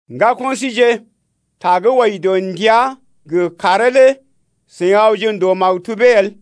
Ŋgako̰ síje, ta gə́ wɔji dɔ ndəa gə kàree lé seḭ awje ndòo maktubee el.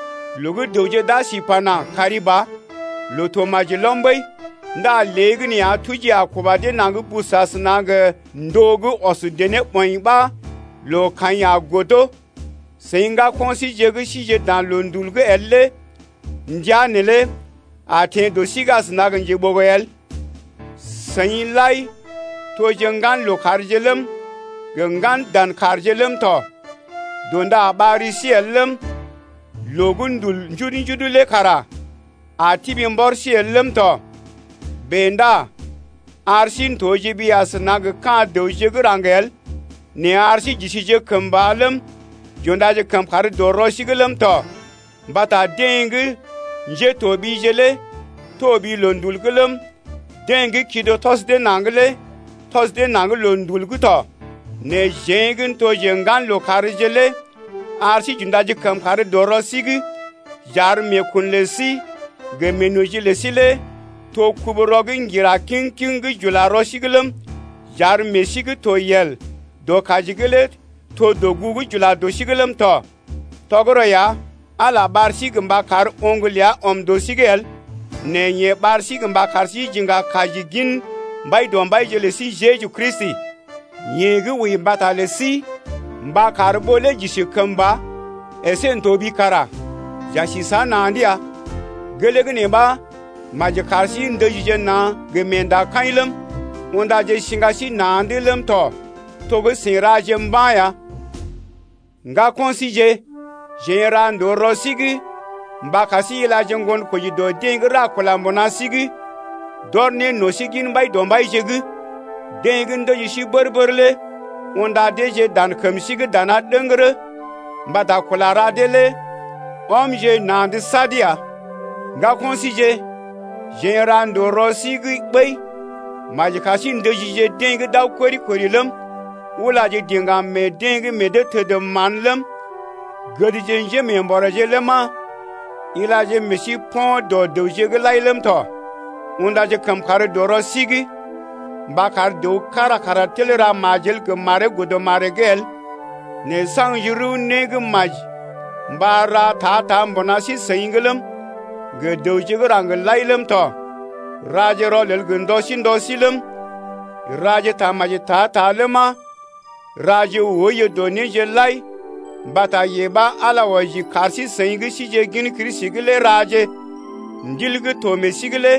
Loo gə́ dəwje d’a si pana: Kari ba, loo to maji lɔm ɓəi!... Ndá léegəneeya tuji a kuba dee naŋg bus asəna gə ndóo gə́ ɔs dené ɓɔḭ ɓa loo kaḭ a godo. Seḭ ŋgako̰ síje gə́ sije dan loondul’g el lé ndəa neelé a teḛ dɔ sí’g asəna gə njeɓogo el. Seḭ lai toje ŋgan lookàrje ləm, gə ŋgan dan kàrje ləm tɔ. Dṵda a ɓar ri sí el ləm, loo gə́ ndul njudu-njudu lé kara a tibi mbɔr sí el ləm tɔ. Bèe ndá ar sí n’toje ɓi asəna gə ka̰ dəwje gə́ raŋg el, nɛ ar sí j’isije kəmba ləm, j’undaje kəmkàr dɔ rɔ sí’g ləm tɔ. Mbata deḛ gə́ njétoɓije lé toɓi loondul’g ləm, deḛ gə́ kido tɔs dee naŋg lé tɔs dee naŋg loondul’g tɔ. Nɛ jeḛ gə́ n’toje ŋgan lookàr lé ar sí j’undaje kəmkàr dɔ rɔ sí’g j’ar meekun lə sí gə meenoji lə sí lé to kubu-rɔ gə́ ŋgira kiŋ-kiŋ gə́ j’ula rɔ sí’g ləm, j’ar meḛ sí gə́ to yel dɔ kaji’g lé to dɔgugu gə́ j’ula dɔ sí’g ləm tɔ. Tɔgərɔ ya, Ala ɓar sí mba kar oŋg ləa ɔm dɔ sí’g el nɛ yeḛ ɓar sí mba kar sí j’iŋga kaji gin Mbaidɔmbaije’g lə sí Jeju Kristi, yeḛ gə́ wəi mbata lə sí mba kar ɓó lé j’isi kəmba əsé n’toɓi kara j’a si səa na̰’d ya. Gelee gə́ nee ɓa maji kar sí ndəjije na̰ gə meendakaḭ ləm, undaje siŋga sí na̰’d ləm tɔ, to gə́ seḭ raje mba̰ ya. Ŋgako̰ síje, jeḛ n’ra ndòo rɔ sí’g mba kar sí ilaje ŋgonkoji dɔ deḛ gə́ ra kula mbuna sí’g d’ɔr ne no̰ sí gin Mbaidɔmbaije’g, deḛ gə́ ndəji sí bər-bər lé. Unda deeje dan kəm sí’g dana ɗəŋgərə mbata kula ra dee lé. Ɔmje na̰’d sad ya. Ŋgako̰ síje, jeḛ n’ra ndòo rɔ sí’g ɓəi: maji kar sí ndəjije deḛ gə́ d’aw kori-kori ləm, ulaje diŋgam meḛ deḛ gə́ meḛ dee təd mán ləm, gədje njémeembɔrèje ləma, ilaje meḛ sí po̰ dɔ dəwje’g lai ləm tɔ. Undaje kəmkàr dɔ rɔ sí’g mba kar dəw kára kara tel ra majel gə maree godə maree’g el nɛ saŋgje rəw né gə́ maji mba ra ta-ta mbuna sí-seḭ’g ləm, gə dəwje gə́ raŋg lai ləm tɔ. Raje rɔlel gə ndɔ sí ndɔ sí ləm, raje tamaji ta-ta ləma, raje oiyo dɔ néje’g lai mbata yee ɓa Ala wɔji kar sí-seḭ gə́ síje gin Kristi’g lé raje. Ndil gə́ to meḛ sí’g lé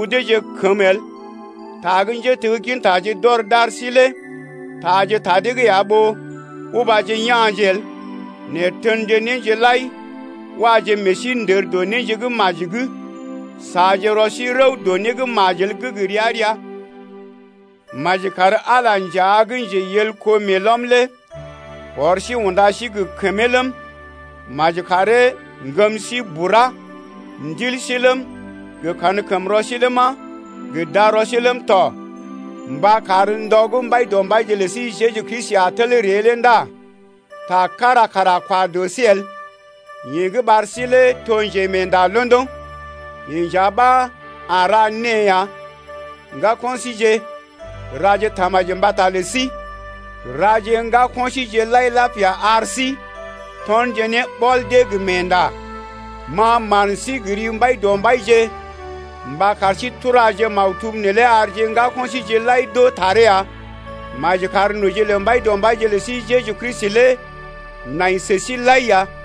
udeeje kəmə el. Ta gə́ njéteggintaje d’ɔr d’ar sí lé taaje ta dee’g ya ɓó ubaje ya̰je el. Nɛ tenje néje lai, waje meḛ sí ndər dɔ néje gə́ maji’g. Saaje rɔ sí rəw dɔ né gə́ majel gə́ gə ria-ria. Maji kar Ala nja gə́ njeyelko meelɔm lé ɔr sí unda sí gə kəmee ləm, maji karee ŋgəm sí bura, ndil sí ləm, gə kankəmrɔ sí ləma, gə darɔ sí ləm tɔ, mba kar ndɔ gə́ Mbaidɔmbaije lə sí Jeju Kristi a tel ree lé ndá ta kára kara a kwa dɔ sí el. Yeḛ gə́ ɓar sí lé to njemeenda londoŋ, yeḛ nja ɓa a ra née ya. Ŋgako̰ síje, raje tamaji mbata lə sí. Raje ŋgako̰ síje lai lapia ar sí tɔnje ne ɓɔl dee gə meendakaḭ. Ma man sí gə ri Mbaidɔmbaije mba kar sí turaje maktub neelé arje ŋgako̰ síje lai d’oo taree ya. Maji kar noji lə Mbaidɔmbaije lə sí Jeju Kristi lé nai sə sí lai ya.